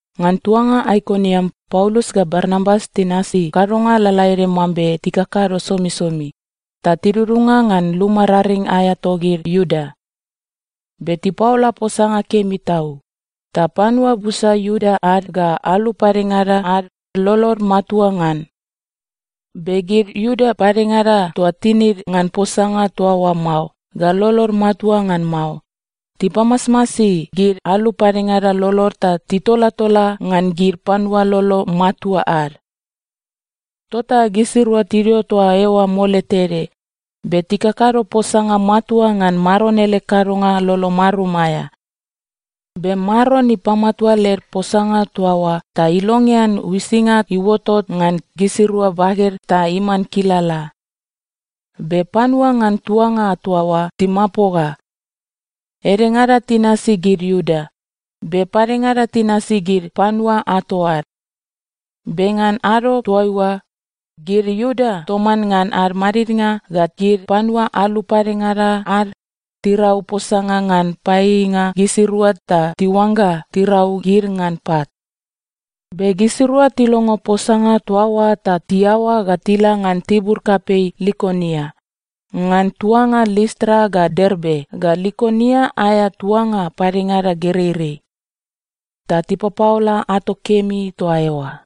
Ngan tuanga Aikoniam Paulus ga Barnabas tinasi kadonga lalaede mambe tikakado somisomi ta tidudunga ngan luma raring aea togid Iuda. Be tipaola posanga kemi tau, ta panua busa Iuda ad ga alu padengada ad lolod matua ngan. Be gid Iuda padengada toa tinid ngan posanga toa oa mao ga lolod matua ngan mao, tipamasmasi gid alu padengada lolod ta titolatola ngan gid panua lolo matua ad. Tota gisirua tidio toa eoa mole tede, be tikakado posanga matua ngan Maron ele kadonga lolo marum aea. Be Maron ipamatua led posanga toa oa ta ilongean uisinga iuotot ngan gisirua baged ta iman kilala. Be panua ngan tuanga toa oa timapoga. Edengada tinasi gid Iuda, be padengada tinasi gid panua ato ad. Be ngan ado toaiua, gid Iuda toman ngan ad madidnga ga gid panua alu padengada ad tirau posanga ngan paieieinga gisirua ta tiuangga tirau gid ngan pat. Be gisirua tilongo posanga toa oa ta tiaoa ga tila ngan tibur kapei Likonia, ngan tuanga Listra ga Derbe ga Likonia aea tuanga padengada gereirei. Ta tipapaola ato kemi toa eoa.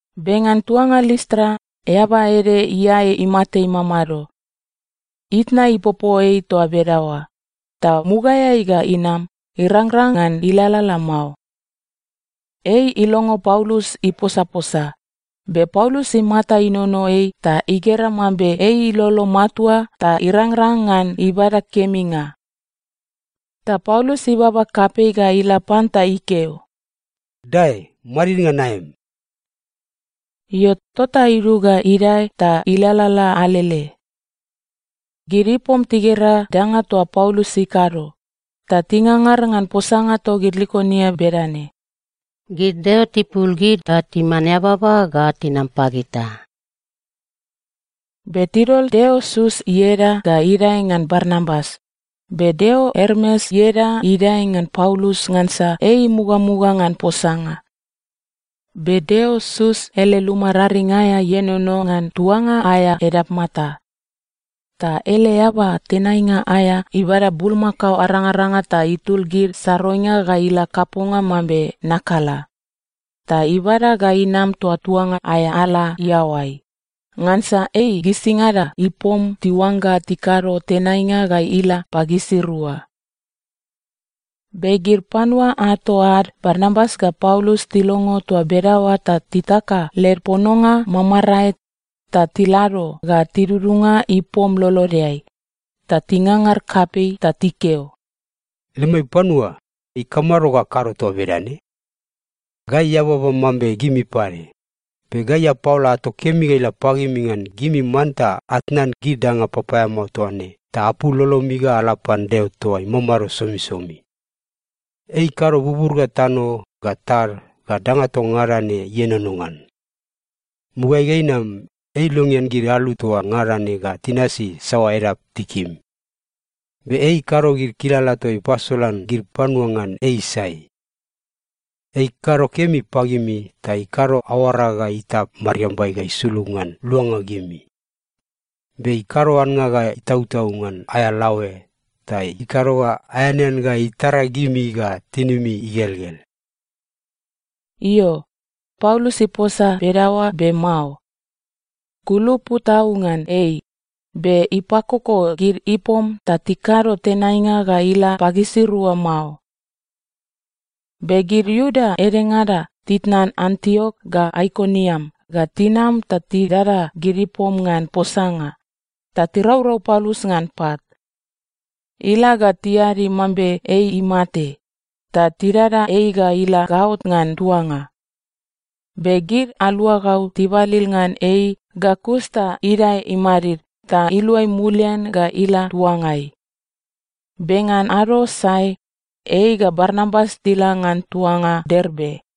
Be ngan tuanga Listra, eaba ede iae imate imamado. Itna ipopo ei toa bedaoa, ta mugaeai ga inam, irangrang ngan ilalala mao. Ei ilongo Paulus iposaposa, be Paulus imata inono ei ta igera mambe ei ilolo matua ta irangrang ngan ibada keminga. Ta Paulus ibaba kapei ga ila pan ta ikeo, “Dae madid ngan aem.” Io, tota idug ga idae ta ilalala alele. Gid ipom tigera danga toa Paulus ikado, ta tingangar ngan posanga togid Likonia bedane, “Gid deo tipul gid ga timan eababa ta tinam pagita!” Be tidol deo Sus ieda ga idae ngan Barnabas, be deo Ermes ieda idae ngan Paulus ngansa ei imugamuga ngan posanga. Be deo Sus ele luma raring aea ienono ngan tuanga aea edapmata. Ta ele eaba tenainga aea ibada bulmakao arangaranga ga itul gid saroinga ga ila kaponga mambe nakala, ta ibada ga inam toa tuanga aea ala iaoai, ngansa ei gisingada ipom tiuangga tikado tenainga ga ila pagisirua. Be gid panua ato ad Barnabas ga Paulus tilongo toa bedaoa ta titaka led pononga mamarae, ta tilado ga tidudunga ipom lolodeai, ta tingangar kapei ta tikeo, “Lemai panua, ikamado ga akado toa bedane? Gai eababa mambe gimi pade! Be gai apaola ato kemi ila pagimi ngan gimi manta atnan gid danga papaeamao toa ne ta apul lolomi ga ala pan Deo toa imamado somisomi. Ei ikado bubur ga tano ga tad ga danga toa ngada ne ienono ngan. Mugaeai ga inam, ei ilongean gid alu toa ngada ne ga tinasi saoa edap tikim. Be ei ikado gid kilala toa ipasolan gid panua ngan ei sai. Ei ikado kemi pagimi ta ikado aoara ga itap mariambai ga isulug ngan luanga gimi, be ikado annga ga itautau ngan aea laoe ta ikado ga aeanean ga itara gimi ga tinimi igelgel.” Io, Paulus iposa bedaoa, be mao. Kulupu tau ngan ei, be ipakoko gid ipom ta tikado tenainga ga ila pagisirua mao. Be gid Iuda edengada titnan Antiok ga Aikoniam ga tinam ta tidada gid ipom ngan posanga, ta tiraurau Paulus ngan pat. Ila ga tiadi mambe ei imate, ta tidada ei ga ila gaot ngan tuanga. Be gid aluagau tibalil ngan ei ga kus ta idae imadid ta iluai mulian ga ila tuangai. Be ngan ado sae, ei ga Barnabas tila ngan tuanga Derbe.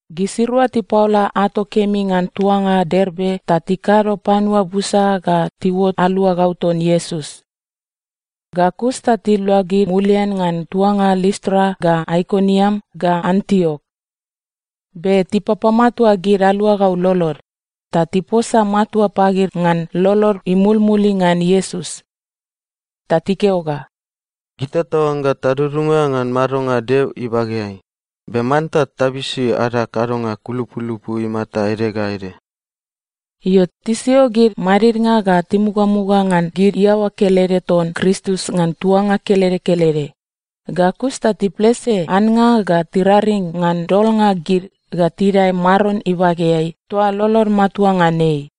Gisirua tipaola ato kemi ngan tuanga Derbe ta tikado panua busa ga tiuot aluagau ton Iesus. Ga kus ta tiluagid mulian ngan tuanga Listra ga Aikoniam ga Antiok. Be tipapamatua gid aluagau lolod, ta tiposa matua pagid ngan lolod imulmuli ngan Iesus. Ta tikeo ga, “Gita taoangga tadudunga ngan madonga Deo ibageai, be manta tabisi ada kadonga kulupulupu imata ede ga ede.” Io, tisio gid madidnga ga timugamuga ngan gid iaoa kelede ton Kristus ngan tuanga kelede kelede, ga kus ta tiplese annga ga tiraring ngan dolnga gid ga tidae Maron ibageai toa lolod matua ngan ei.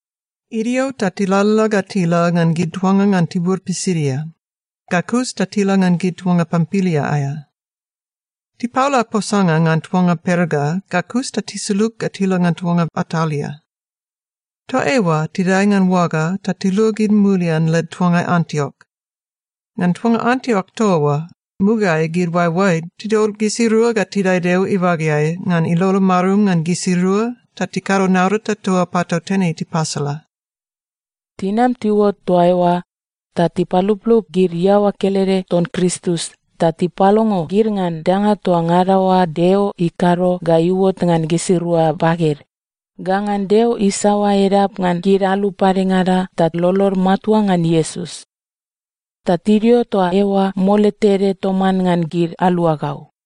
Idio ta tilalala ga tila ngan gid tuanga ngan tibur Pisidia, ga kus ta tila ngan gid tuanga Pampilia aea. Tipaola posanga ngan tuanga Perga ga kus ta tisulug ga tila ngan tuanga Atalia. Toa eoa tidae ngan oaga ta tiluagid mulian led tuangai Antiok. Ngan tuanga Antiok toa oa, mugaeai gid oaeoaed tidol gisirua ga tidae Deo ibageai ngan ilolo marum ngan gisirua ta tikado naurata toa patautene tipasala. Tinam tiuot toa eoa, ta tipaluplup gid iaoa kelede ton Kristus ta tipalongo gid ngan danga toa ngada oa Deo ikado ga iuot ngan gisirua baged, ga ngan Deo isaoa edap ngan gid alu padengada ta lolod matua ngan Iesus. Ta tidio toa eoa mole tede toman ngan gid aluagau.